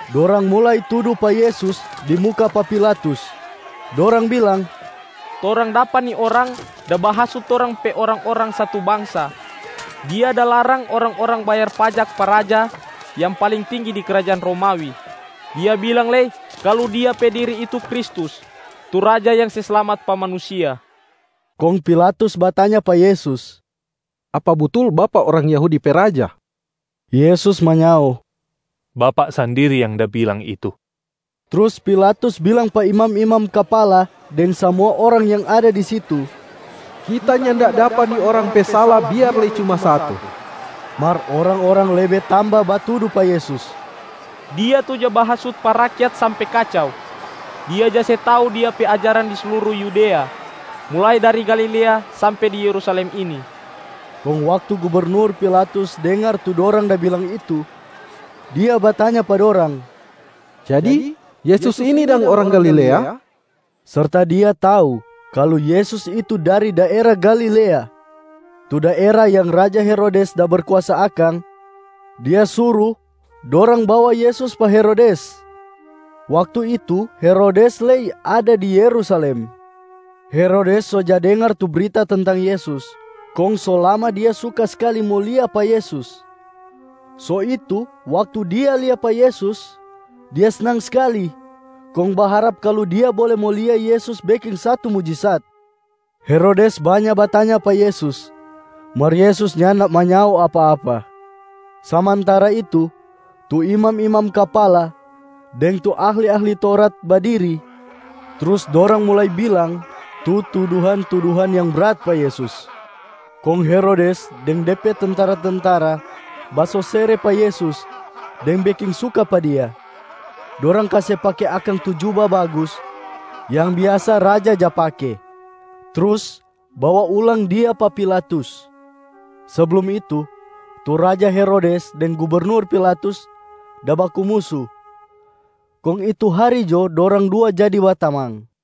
Dorang mulai tudu pa Yesus di muka pa Pilatus, dorang bilang, “Torang dapa ni orang da bahasut torang pe orang-orang satu bangsa. Dia da larang orang-orang bayar pajak pa raja yang paling tinggi di krajaan Romawi. Dia bilang lei kalu Dia pe diri itu Kristus, tu Raja yang se slamat pa manusia.” Kong Pilatus batanya pa Yesus, “Apa butul Bapak orang Yahudi pe Raja?” Yesus manyao, “Bapak sandiri yang da bilang itu.” Trus Pilatus bilang pa imam-imam kapala deng samua orang yang ada di situ, “Kita nyanda dapa ni Orang pe sala biar lei cuma satu.” Mar orang-orang lebe tamba batudu pa Yesus, “Dia tu ja bahasut pa rakyat sampe kacau. Dia ja se tau Dia pe ajaran di sluru Yudea, mulai dari Galilea sampe di Yerusalem ini.” Kong waktu gubernur Pilatus dengar tu dorang da bilang itu, dia batanya pa dorang, “Jadi, Yesus ini dang orang Galilea?” Serta dia tau kalu Yesus itu dari daera Galilea tu daera yang raja Herodes da berkuasa akang, dia suru dorang bawa Yesus pa Herodes. Waktu itu, Herodes lei ada di Yerusalem. Herodes so ja dengar tu brita tentang Yesus, kong so lama dia suka skali mo lia pa Yesus. So itu waktu dia lia pa Yesus, dia snang skali kong baharap kalu dia bole mo lia Yesus beking satu mujisat. Herodes banya batanya pa Yesus, mar Yesus nyanda manyao apa-apa. Samantara itu, tu imam-imam kapala deng tu ahli-ahli Taurat badiri trus dorang mulai bilang tu tuduhan-tuduhan yang brat pa Yesus. Kong Herodes deng de pe tentara-tentara basosere pa Yesus deng beking suka pa Dia. Dorang kase pake akang tu juba bagus yang biasa raja ja pake, trus bawa ulang Dia pa Pilatus. Seblum itu, tu raja Herodes deng gubernur Pilatus da baku musu, kong itu hari jo dorang dua jadi batamang.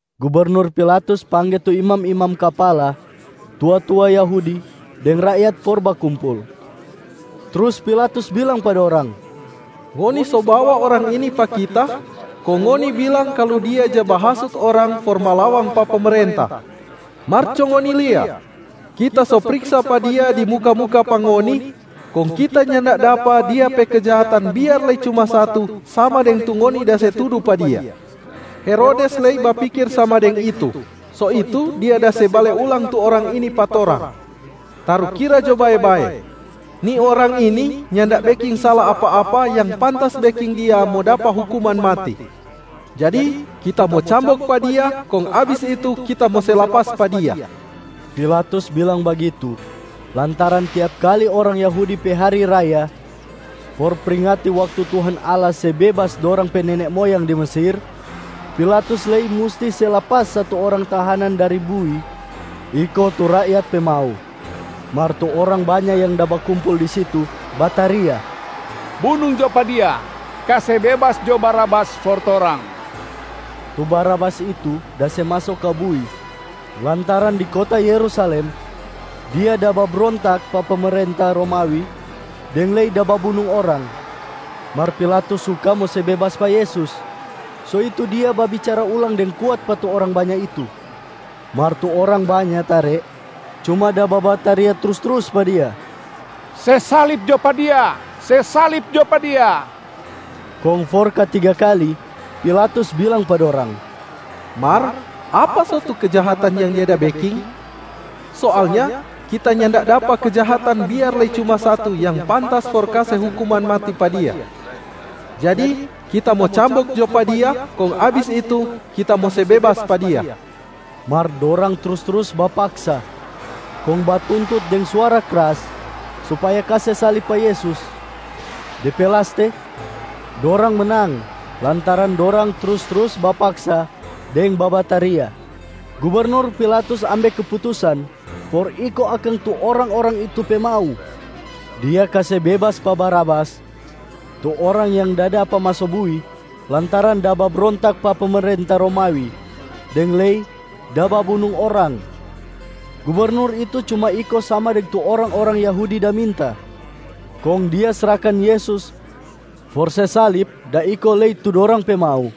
Gubernur Pilatus pangge tu imam-imam kapala, tua-tua Yahudi deng rakyat for bakumpul. Trus Pilatus bilang pa dorang, “Ngoni so bawa Orang ini pa kita, kong ngoni bilang kalu Dia ja bahasut orang for malawang pa pemerenta. Mar co ngoni lia, kita so priksa pa Dia di muka-muka pa ngoni, kong kita nyanda dapa Dia pe kejahatan biar lei cuma satu sama deng tu ngoni da se tudu pa Dia. Herodes lei bapikir sama deng itu, so itu dia da se bale ulang tu Orang ini pa torang. Tarukira jo bae-bae, ni Orang ini nyanda beking sala apa-apa yang pantas beking Dia mo dapa hukuman mati. Jadi kita mo cambok pa Dia, kong abis itu kita mo se lapas pa Dia.” [ Pilatus bilang bagitu lantaran tiap kali orang Yahudi pe hari raya for pringati waktu Tuhan Allah se bebas dorang pe nene moyang di Mesir, Pilatus lei musti se lapas satu orang tahanan dari bui iko tu rakyat pe mau.] Mar tu orang banya yang da bakumpul di situ bataria, “Bunung jo pa Dia! Kase bebas jo Barabas for torang!” Tu Barabas itu da se maso ka bui lantaran di kota Yerusalem dia da babrontak pa pemerenta Romawi deng lei da babunung orang. Mar Pilatus suka mo se bebas pa Yesus, so itu dia babicara ulang deng kuat pa tu orang banya itu. Mar tu orang banya tare cuma da babataria trus-trus pa dia, “Se salib jo pa Dia, se salib jo pa Dia!” Kong for katiga kali Pilatus bilang pa dorang, “Mar apa so tu kejahatan yang Dia da beking? Soalnya kita nyanda dapa kejahatan biar lei cuma satu yang pantas for kase hukuman mati pa Dia. Jadi kita mo cambok jo pa Dia kong abis itu kita mo se bebas pa Dia.” Mar dorang trus-trus bapaksa kong batuntut deng suara kras supaya kase salib pa Yesus. De pe laste dorang menang lantaran dorang trus-trus bapaksa deng babataria. Gubernur Pilatus ambe keputusan for iko akang tu orang-orang itu pe mau. Dia kase bebas pa Barabas tu orang yang da dapa maso bui lantaran da babrontak pa pemerenta Romawi deng lei da babunung orang, gubernur itu cuma iko sama deng tu orang-orang Yahudi da minta, kong dia srahkan Yesus for se salib da iko lei tu dorang pe mau.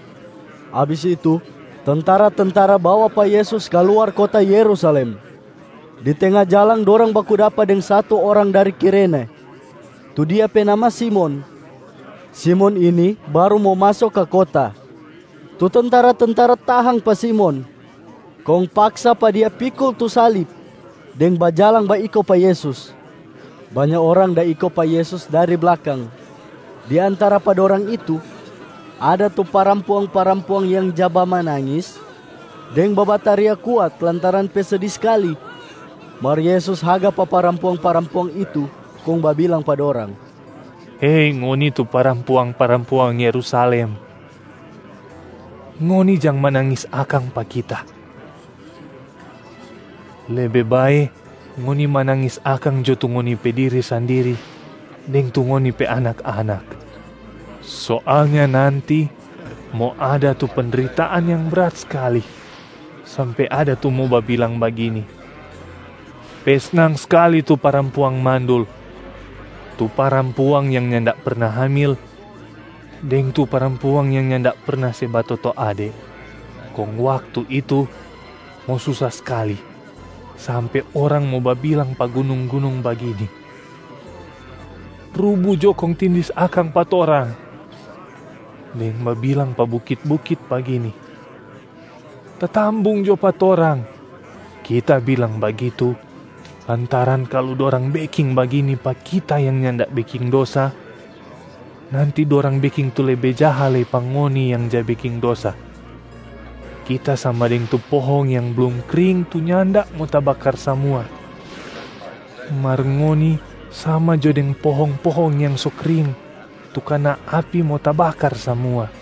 Abis itu tentara-tentara bawa pa Yesus ka luar kota Yerusalem. Di tenga jalang dorang baku dapa deng satu orang dari Kirene tu dia pe nama Simon. Simon ini baru mo maso ka kota. Tu tentara-tentara tahang pa Simon kong paksa pa dia pikul tu salib deng bajalang baiko pa Yesus. Banya orang da iko pa Yesus dari blakang. Di antara pa dorang itu ada tu parampuang-parampuang yang ja bamanangis deng babataria kuat lantaran pe sedi skali. Mar Yesus haga pa parampuang-parampuang itu kong babilang pa dorang, “Hei ngoni tu parampuang-parampuang Yerusalem! Ngoni jang manangis akang pa Kita. Lebe bae ngoni manangis akang jo tu ngoni pe diri sandiri deng tu ngoni pe anak-anak! Soalnya nanti mo ada tu pendritaan yang brat skali sampe ada tu mo babilang bagini, ‘Pe snang skali tu parampuang mandul, tu parampuang yang nyanda perna hamil deng tu parampuang yang nyanda perna se batoto ade.’ Kong waktu itu mo susa skali sampe orang mo babilang pa gunung-gunung bagini, ‘Rubu jo kong tindis akang pa torang!’ deng babilang pa bukit-bukit bagini, ‘Tatambung jo pa torang!’ Kita bilang bagitu lantaran kalu dorang beking bagini pa Kita yang nyanda beking dosa, nanti dorang beking tu lebe jaha lei pa ngoni yang ja beking dosa. Kita sama deng tu pohong yang blum kring tu nyanda mo tabakar samua, mar ngoni sama jo deng pohong-pohong yang so kring tu kana api mo tabakar samua.”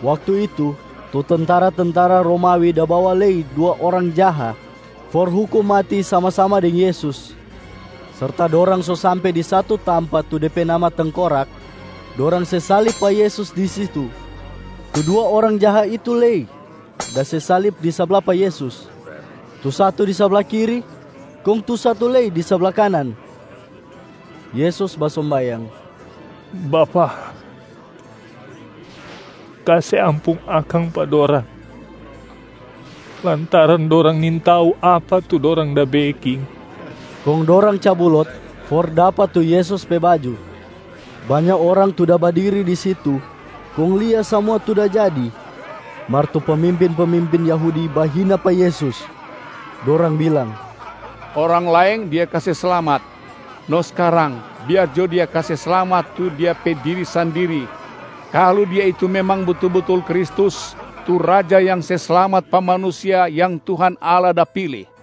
Waktu itu, tu tentara-tentara Romawi da bawa lei dua orang jaha for hukum mati sama-sama deng Yesus. Serta dorang so sampe di satu tampa tu de pe nama Tengkorak, dorang se salib pa Yesus di situ. Tu dua orang jaha itu lei da se salib di sabla pa Yesus, tu satu di sabla kiri kong tu satu lei di sabla kanan. [ Yesus basombayang, “Bapa, kase ampung akang pa dorang lantaran dorang nintau apa tu dorang da beking.”] Kong dorang cabu lot for dapa tu Yesus pe baju. Banya orang tu da badiri di situ kong lia samua tu da jadi, mar tu pemimpin-pemimpin Yahudi bahina pa Yesus. Dorang bilang, “Orang laeng Dia kase slamat. No skarang biar jo Dia kase slamat tu Dia pe diri sandiri kalu Dia itu memang butul-butul Kristus tu Raja yang se slamat pa manusia yang Tuhan Allah da pili.”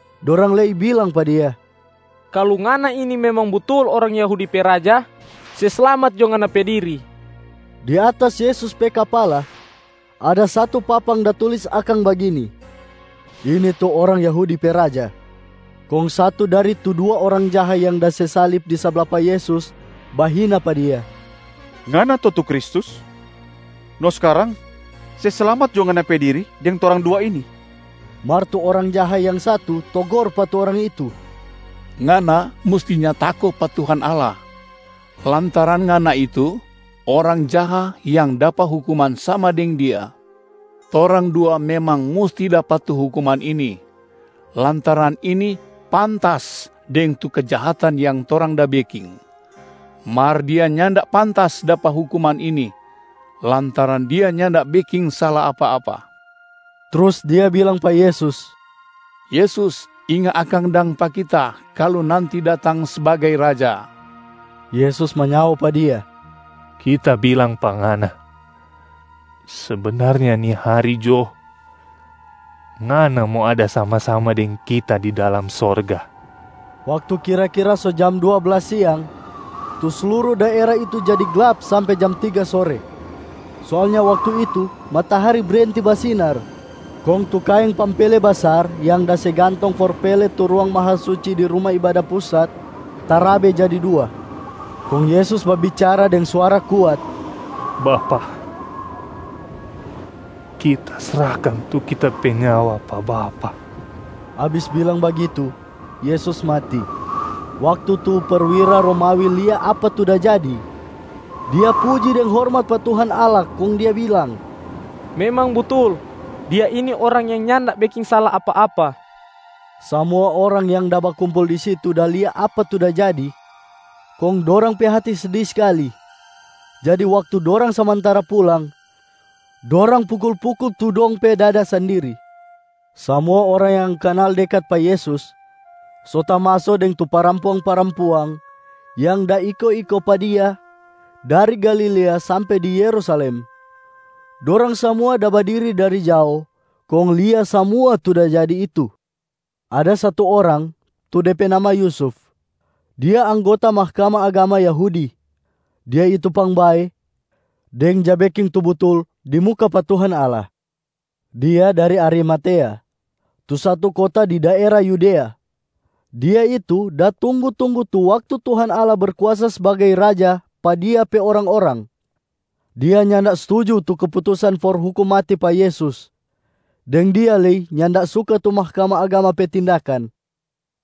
Dorang lei bilang pa Dia, “Kalu Ngana ini memang butul orang Yahudi pe Raja, se slamat jo Ngana pe diri.” Di atas Yesus pe kapala, ada satu papang da tulis akang bagini, “Ini tu orang Yahudi pe Raja.” Kong satu dari tu dua orang jaha yang da se salib di sabla pa Yesus bahina pa Dia, “Ngana to tu Kristus? No skarang se slamat jo Ngana pe diri deng torang dua ini!” Mar tu orang jaha yang satu togor pa tu orang itu, “Ngana mustinya tako pa Tuhan Allah, lantaran ngana itu orang jaha yang dapa hukuman sama deng Dia. Torang dua memang musti dapa tu hukuman ini lantaran ini pantas deng tu kejahatan yang torang da beking. Mar Dia nyanda pantas dapa hukuman ini, lantaran Dia nyanda beking sala apa-apa.” Trus dia bilang pa Yesus, “Yesus, inga akang dang pa kita kalu nanti datang sbagai Raja.” Yesus manyao pa dia, “Kita bilang pa ngana, sebenarnya ni hari jo, ngana mo ada sama-sama deng Kita di dalam sorga.” Waktu kira-kira so jam dua blas siang, tu sluru daera itu jadi glap sampe jam tiga sore. Soalnya waktu itu matahari brenti basinar. Kong tu kaeng pampele basar yang da se gantong for pele tu ruang Mahasuci di Ruma Ibada Pusat tarabe jadi dua. Kong Yesus babicara deng suara kuat, “Bapa, Kita srahkan tu Kita pe nyawa pa Bapa.” Abis bilang bagitu Yesus mati. Waktu tu perwira Romawi lia apa tu da jadi, dia puji deng hormat pa Tuhan Allah kong dia bilang, “Memang butul, Dia ini Orang yang nyanda beking sala apa-apa!” Samua orang yang da bakumpul di situ da lia apa tu da jadi, kong dorang pe hati sedi skali. Jadi waktu dorang samantara pulang, dorang pukul-pukul tu dong pe dada sandiri. Samua orang yang kanal dekat pa Yesus so tamaso deng tu parampuang-parampuang yang da iko-iko pa Dia dari Galilea sampe di Yerusalem, dorang samua da badiri dari jao kong lia samua tu da jadi itu. Ada satu orang tu de pe nama Yusuf. Dia anggota Mahkamah Agama Yahudi. Dia itu pangbae deng ja beking tu butul di muka pa Tuhan Allah. Dia dari Arimatea, tu satu kota di daera Yudea. Dia itu da tunggu-tunggu tu waktu Tuhan Allah Berkuasa sbagai Raja pa Dia pe orang-orang. Dia nyanda stuju tu keputusan for hukum mati pa Yesus, deng dia lei nyanda suka tu Mahkamah Agama pe tindakan.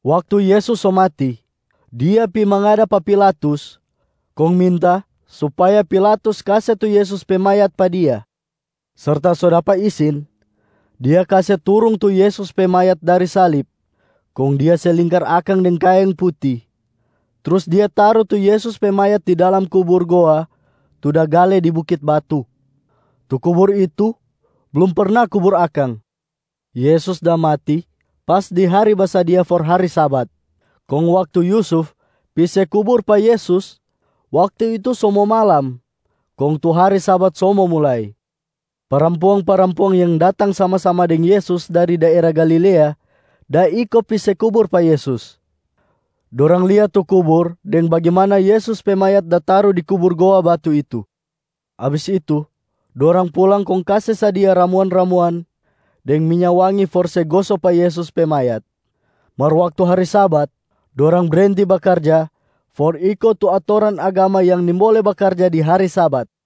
Waktu Yesus so mati, dia pi mangada pa Pilatus kong minta supaya Pilatus kase tu Yesus pe mayat pa dia. Serta so dapa isin, dia kase turung tu Yesus pe mayat dari salib kong dia se lingkar akang deng kaeng puti, trus dia taru tu Yesus pe mayat di dalam kubur goa tu da gale di bukit batu. Tu kubur itu blum perna kubur akang. Yesus da mati pas di hari basadia for hari Sabat. Kong waktu Yusuf pi se kubur pa Yesus, waktu itu so mo malam kong tu hari Sabat so mo mulai. Parampuang-parampuang yang datang sama-sama deng Yesus dari daera Galilea da iko pi se kubur pa Yesus. Dorang lia tu kubur deng bagimana Yesus pe mayat da taru di kubur goa batu itu. Abis itu dorang pulang kong kase sadia ramuan-ramuan deng minya wangi for se goso pa Yesus pe mayat. Mar waktu hari Sabat, dorang brenti bakarja for iko tu atoran agama yang nimbole bakarja di hari Sabat.